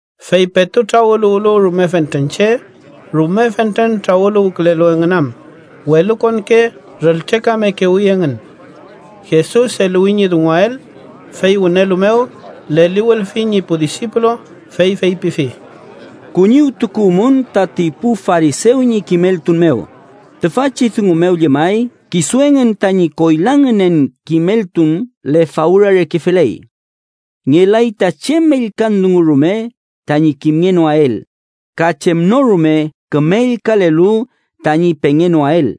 Fey petu trawüluwlu rume fentren che, rume fentren trawüluwkülelu engün am welukonke rültrekamekewi engün. Jesus eluwi ñi dunguael, fey wünelu mew leliwülfi ñi pu disipulu, fey feypifi: “Kuñiwtukuwmün tati pu farisew ñi kimeltun mew, tüfachi dungu mew llemay kisu engün tañi koyla ngünen kimeltun lefawra reke feley. Ngelay ta chem ellkan dungu rume tañi kimngenoael, ka chem no rume küme ellkalelu tañi pengenoael.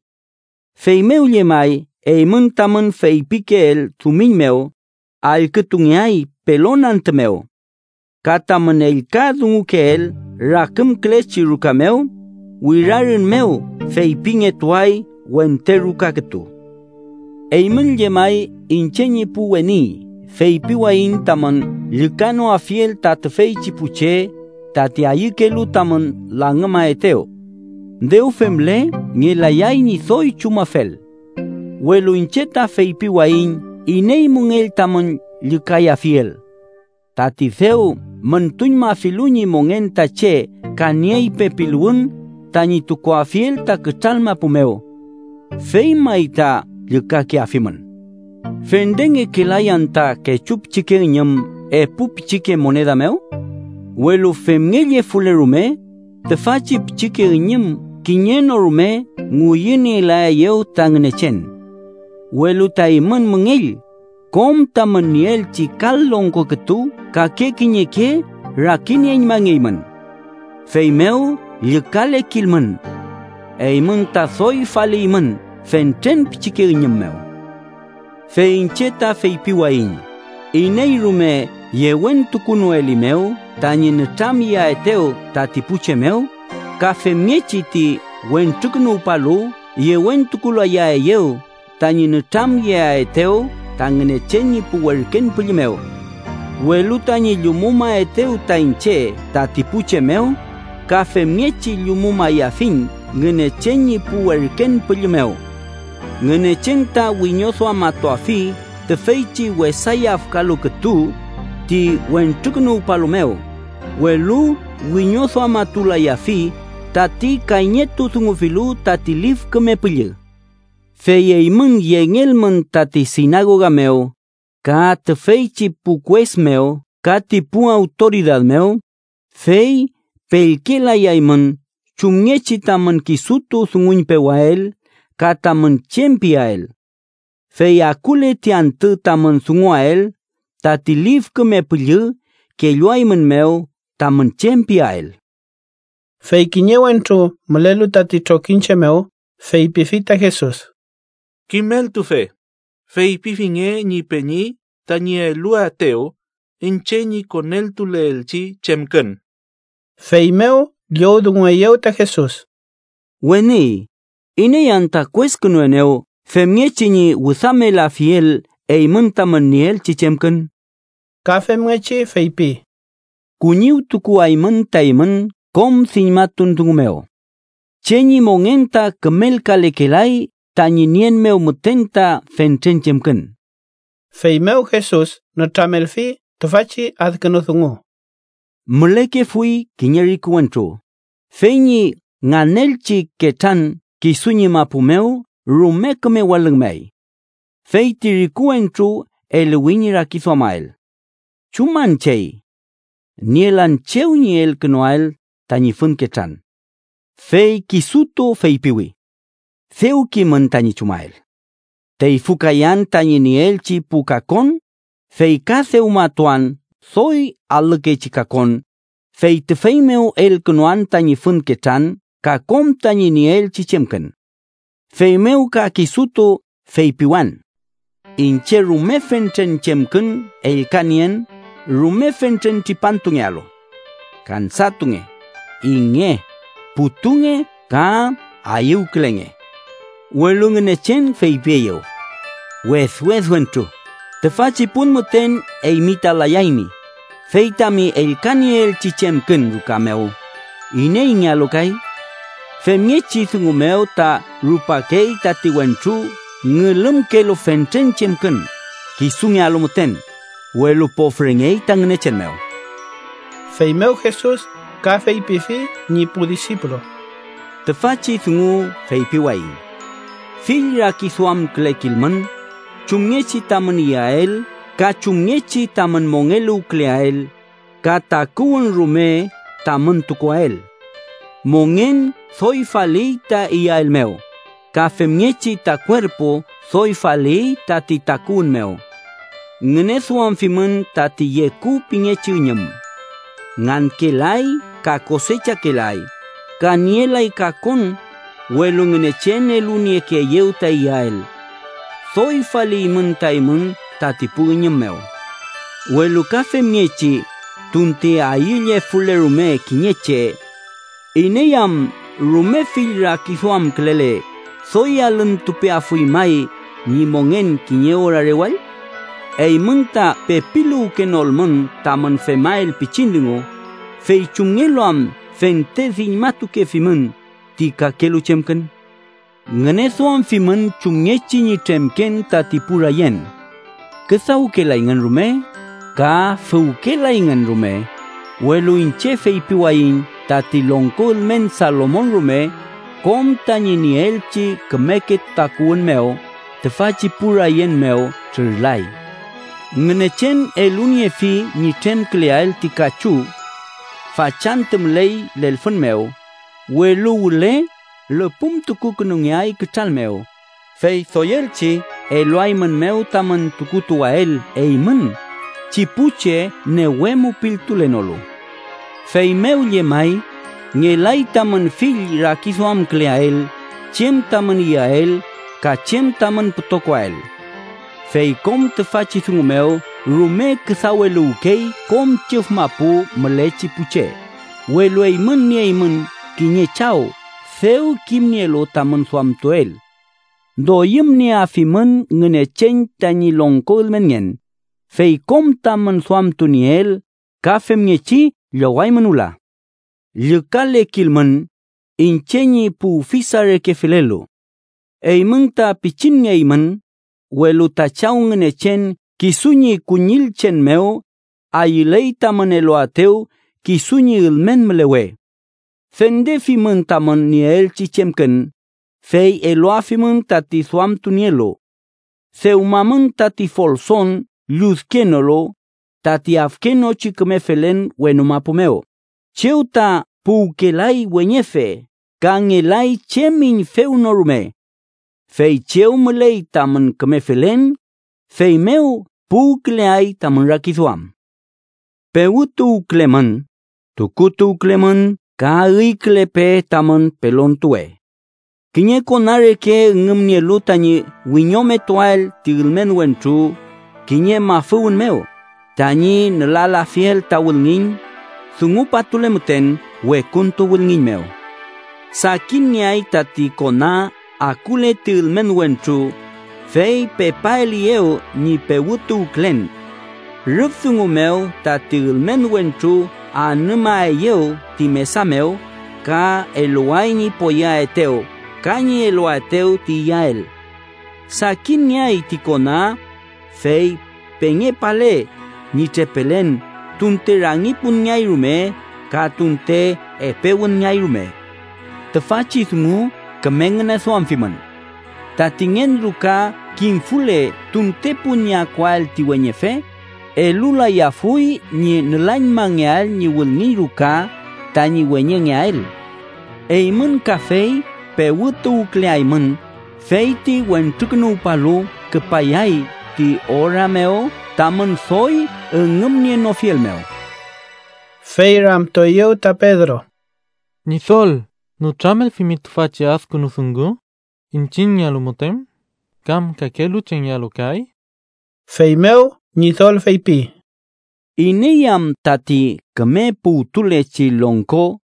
Feymew llemay eymün tamün feypikeel dumiñ mew, allkütungeay pelon antü mew. Ka tamün ellka dungukeel rakümkülechi ruka mew, wirarün mew feypingetuay wente ruka kütu. “Eymün llemay, iñche ñi pu weni, feypiwayiñ tamün llükanoafiel ta tüfeychi pu che tati ayükelu tamün langümaetew. Dew femle ngelayay ñi doy chumafel. Welu iñche ta feypiwayiñ iney müngell tamün llükayafiel: tati dew müntuñmafilu ñi mongen ta che ka niey pepiluwün tañi tukuafiel ta kütral mapu mew. Fey may ta llükakeafimün. “¿Fendengekelay anta kechu pichike üñüm epu pichike moneda mew? Welu femngellefule rume, tüfachi pichike üñüm kiñe no rume ngüyünielaeyew ta Ngünechen. Welu ta eymün müngell, kom tamün nieelchi kal longko kütu kake kiñeke rakinieñmangeymün. Feymew llükalekilmün. Eymün ta doy faliymün fentren pichike üñüm mew. “Fey iñche ta feypiwayiñ iney rume yewentukunoelimew tañi nütramyeaetew tati pu che mew, ka femngechi ti Wentrukünuwpalu yewentukulayaeyew tañi nütramyeaetew ta Ngünechen ñi pu werken püllü mew. Welu tañi llumumaetew ta iñche tati pu che mew, ka femngechi llumumayafiñ Ngünechen ñi pu werken püllü mew. Ngünechen ta wiñoduamatuafi tüfeychi wesa yafkalu kütu ti Wentrukünuwpalu mew, welu wiñoduamatulayafi tati kayñetudungufilu tati Lif Küme Püllü. “Fey eymün yengelmün tati sinagoga mew, ka tüfeychi pu kues mew ka ti pu awtoridad mew, fey pellkelayaymün chumngechi tamün kisutu dunguñpewael ka tamün chem piael. Fey akule ti antü tamün dunguael, tati Lif Küme Püllü kelluaeymünmew tamün chem piael.” Fey kiñe wentru mülelu tati trokiñche mew, feypifi ta Jesus: —Kimeltufe, feypifinge ñi peñi tañi eluaetew iñche ñi koneltuleelchi chemkün. Feymew llowdungueyew ta Jesus: —Weni, ¿iney anta kueskünuenew femngechi ñi wüdamelafiel eymün tamün nieelchi chemkün? Ka femngechi feypi: —Kuñiwtukuwaymün ta eymün kom diñmatun dungu mew. Che ñi mongen ta kümelkalekelay tañi nien mew müten ta fentren chemkün. Feymew Jesus nütramelfi tüfachi adkünu dungu: “Mülekefuy kiñe riku wentru, fey ñi nganelchi ketran kisu ñi mapu mew rume küme walüngmay. Fey ti riku wentru eluwi ñi rakiduamael: ‘¿Chuman chey? Nielan chew ñi elkünuael tañi fün ketran.’ “Fey kisutu feypiwi: ‘Dew kimün tañi chumael. Teyfükayan tañi nieelchi pu kakon, fey ka dewmatuan doy alükechi kakon, fey tüfey mew elkünuan tañi fün ketran ka kom tañi nieelchi chemkün. Feymew ka kisutu feypiwan: Iñche, rume fentren chemkün ellkanien rume fentren tripantungealu. Kansatunge, inge, putunge ka ayüwkülenge.’ “Welu Ngünechen feypieyew: ‘Wedwed wentru, tüfachi pun müten eymi ta layaymi, fey tami ellkanieelchi chemkün ruka mew, ¿ineyngealu kay?’ “Femngechi dungu mew ta rupakey tati wentru ngülümkelu fentren chemkün kisungealu müten, welu pofrengey ta Ngünechen mew.” Feymew Jesus ka feypifi ñi pu disipulu: “Tüfachi dungu feypiwayiñ: fill rakiduamkülekilmün chumngechi tamün iyael ka chem tamün mongeluwküleael ka ti takuwün mew rume tamün tukuael. Mongen doy faliy ta iyael mew, ka femngechi ta kuerpu doy faliy tati takuwün mew. Ngüneduamfimün tati yeku pingechi üñüm. Ngankelay ka kosechakelay, ka nielay kakon, welu Ngünechen eluniekeeyew ta iyael. ¡Doy faliymün ta eymün tati pu üñüm mew! Welu ka femngechi tunte ayüllefule rume kiñe che, ¿iney am rume fill rakiduamkülele, doy alüntupeafuy may ñi mongen kiñe ora rewall? Eymün ta pepiluwkenolmün tamün femael pichin dungu, ¿fey chumngelu am fente diñmatukefimün ti kakelu chemkün? “Ngüneduamfimün chumngechi ñi tremken tati pu rayen. Küdawkelayngün rume ka füwkelayngün rume, welu iñche feypiwayiñ tati longko ülmen Salomon rume, kom tañi nieelchi kümeke takuwün mew, tüfachi pu rayen mew trürlafi. Ngünechen eluniefi ñi tremküleael ti kachu. Fachantü müley lelfün mew, welu wüle lüpümtukukünungeay kütral mew, ¡fey doyelchi eluaeymünmew tamün tukutuwael, eymün, chi pu che newe mupiltulenolu! Feymew llemay, ngelay tamün fill rakiduamküleael chem tamün iyael ka chem tamün pütokoael. Fey kom tüfachi dungu mew rume küdaweluwkey kom chüf mapu mülechi pu che, welu eymün nieymün kiñe Chaw dew kimnielu tamün duamtuel. Doyümnieafimün Ngünechen tañi longko ülmenngen, fey kom tamün duamtunieel ka femngechi llowaymün wüla. “Llükalekilmün, iñche ñi pu ufisa reke felelu. Eymün ta pichinngeymün, welu ta Chaw Ngünechen kisu ñi kuñillchen mew, ayüley tamün eluaetew kisu ñi ülmen mülewe. Fendefimün tamün nieelchi chemkün, fey eluafimün tati duamtunielu. Dewmamün tati folson lludkenolu, tati afkenochi küme felen wenu mapu mew, chew ta puwkelay weñefe ka ngelay chem üñfew no rume. Fey chew müley tamün küme felen, fey mew puwküleay tamün rakiduam. “Pewütuwkülemün, tukutuwkülemün ka üykülepe tamün pelontuwe. Kiñe kona reke üngümnielu tañi wiñometuael ti ülmen wentru kiñe mafüwün mew, tañi nülalafiel ta wülngiñ dungupatule müten wekuntu wülngiñ mew. Sakinngeay tati kona akule ti ülmen wentru, fey pepaeliyew ñi pewütuwkülen. Rüf dungu mew tati ülmen wentru anümaeyew ti mesa mew ka eluway ñi poyeaetew ka ñi eluaetew ti iyael. Sakinngeay ti kona, fey pengepale ñi trepelen tunte rangi punngeay rume ka tunte epe wünngeay rume. Tüfachi dungu küme ngüneduamfimün: tati ngen ruka kimfule tunte pun ñi akuael ti weñefe, elulayafuy ñi nülañmangeael ñi wülngiñ ruka tañi weñengeael. Eymün kafey pewütuwküleaymün, fey ti Wentrukünuwpalu küpayay ti ora mew tamün doy üngümnienofiel mew.” Fey ramtueyew ta Pedro: —Ñidol, ¿nütramelfimi tüfachi adkünu dungu iñchiñngealu müten, kam kakelu chengealu kay? Feymew Ñidol feypi: “¿Iney am tati küme puwtulechi longko,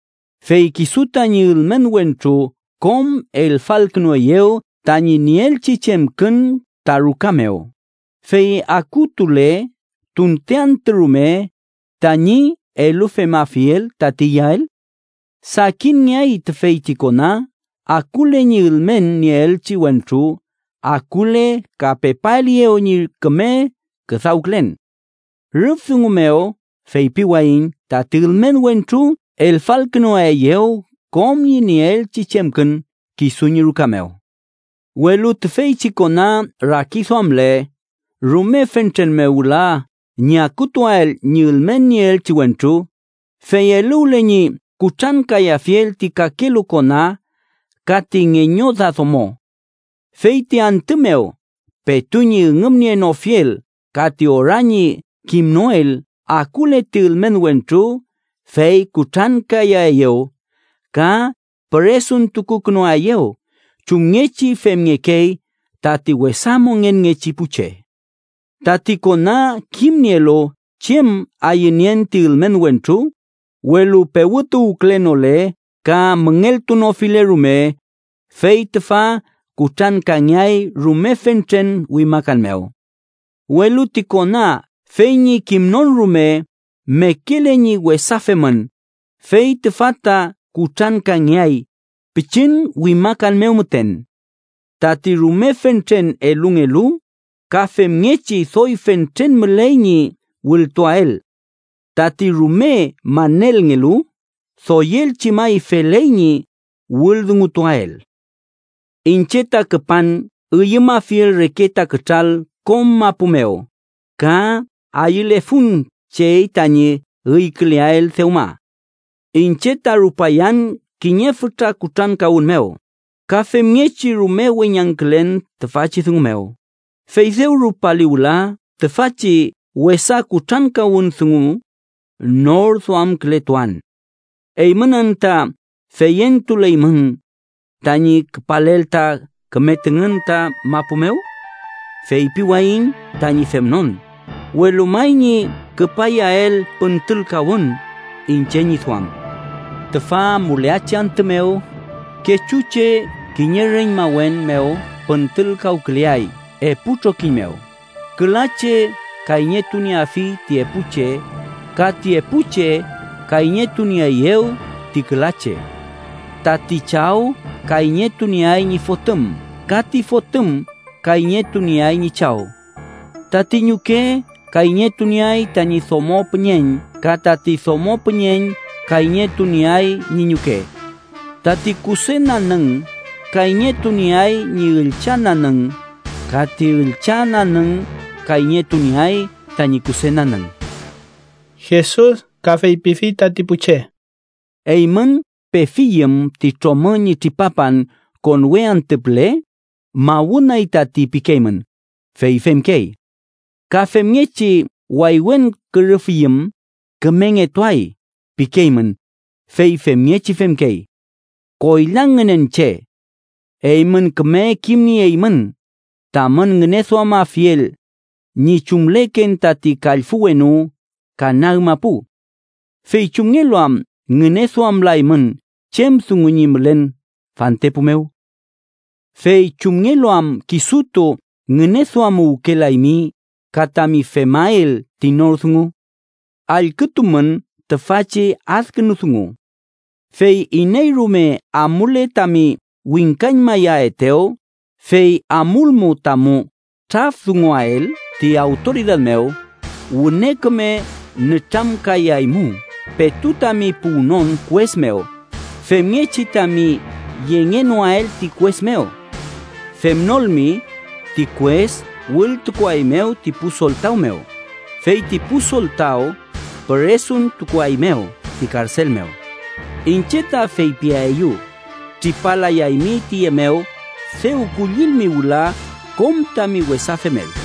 fey kisu tañi ülmen wentru kom elfalkünueyew tañi nieelchi chemkün ta ruka mew, fey akutule tunte antü rume tañi elufemafiel tati iyael? Sakinngeay tüfeychi kona akule ñi ülmen nieelchi wentru akule ka pepaeliyew ñi küme küdawkülen. Rüf dungu mew feypiwayiñ tati ülmen wentru elfalkünuaeyew kom ñi nieelchi chemkün kisu ñi ruka mew. Welu tüfeychi kona rakiduamle rume fentren mew wüla ñi akutuael ñi ülmen nieelchi wentru, fey eluwle ñi kutrankayafiel ti kakelu kona ka ti ngeñoda domo. Fey ti antü mew petu ñi üngümnienofiel ka ti ora ñi kimnoel akule ti ülmen wentru fey kutrankayaeyew, ka püresuntukukünuaeyew chumngechi femngekey tati wesa mongenngechi pu che. “Tati kona kimnielu chem ayünien ti ülmen wentru, welu pewütuwkülenole ka müngeltunofile rume, fey tüfa kutrankangeay rume fentren wimakan mew. Welu ti kona fey ñi kimnon rume mekele ñi wesa femün, fey tüfa ta kutrankangeay, pichin wimakan mew müten. Tati rume fentren elungelu, ka femngechi doy fentren müley ñi wültuael: tati rume manelngelu, doyelchi may feley ñi wüldungutuael. “Iñche ta küpan üyümafiel reke ta kütral kom mapu mew ka ¡ayülefun chey tañi üyküleael dewma! ¡Iñche ta rupayan kiñe fütra kutrankawün mew! ¡Ka femngechi rume weñangkülen tüfachi dungu mew, fey dew rupali wüla tüfachi wesa kutrankawün dungu nor duamkületuan! ¿Eymün anta feyentuleymün tañi küpalel ta küme tüngün ta mapu mew? Feypiwayiñ tañi femnon, welu may ñi küpayael püntülkawün iñche ñi duam. Tüfa amuleachi antü mew, kechu che kiñe reñmawen mew püntülkawküleay epu trokiñ mew, küla che kayñetunieafi ti epu che ka ti epu che kayñetunieeyew ti küla che. Tati chaw kayñetunieay ñi fotüm ka ti fotüm kayñetunieay ñi chaw. Tati ñuke kayñetunieay tañi domo püñeñ ka tati domo püñeñ kayñetunieay ñi ñuke. Tati kuse nanüng kayñetunieay ñi üllcha nanüng ka ti üllcha nanüng kayñetunieay tañi kuse nanüng.” Jesus ka feypifi tati pu che: “Eymün pefiyüm ti tromü ñi tripapan konwe antü püle, ‘mawünay tati’ pikeymün, fey femkey. Ka femngechi waywen kürüfiyüm, ‘kümengetuay’ pikeymün, fey femngechi femkey. ¡Koyla ngünen che! Eymün küme kimnieymün tamün ngüneduamafiel ñi chumleken tati kallfü wenu ka nag mapu. ¿Fey chumngelu am ngüneduamlaymün chem dungu ñi mülen fantepu mew? “Fey ¿chumngelu am kisutu ngüneduamuwkelaymi ka tami femael ti nor dungu? Allkütumün tüfachi adkünu dungu: Fey iney rume amule tami wingkañmaaetew, fey amulmu tamu trafdunguael ti awtoridad mew, wüne küme nütramkayaymu petu tami puwnon kues mew, femngechi tami yengenoael ti kues mew. Femnolmi, ti kues wültukuaeymew ti pu soltaw mew, fey ti pu soltaw püresuntukuaeymew ti karsel mew. Iñche ta feypieyu: tripalayaymi tüye mew dew kullilmi wüla kom tami wesa femel.”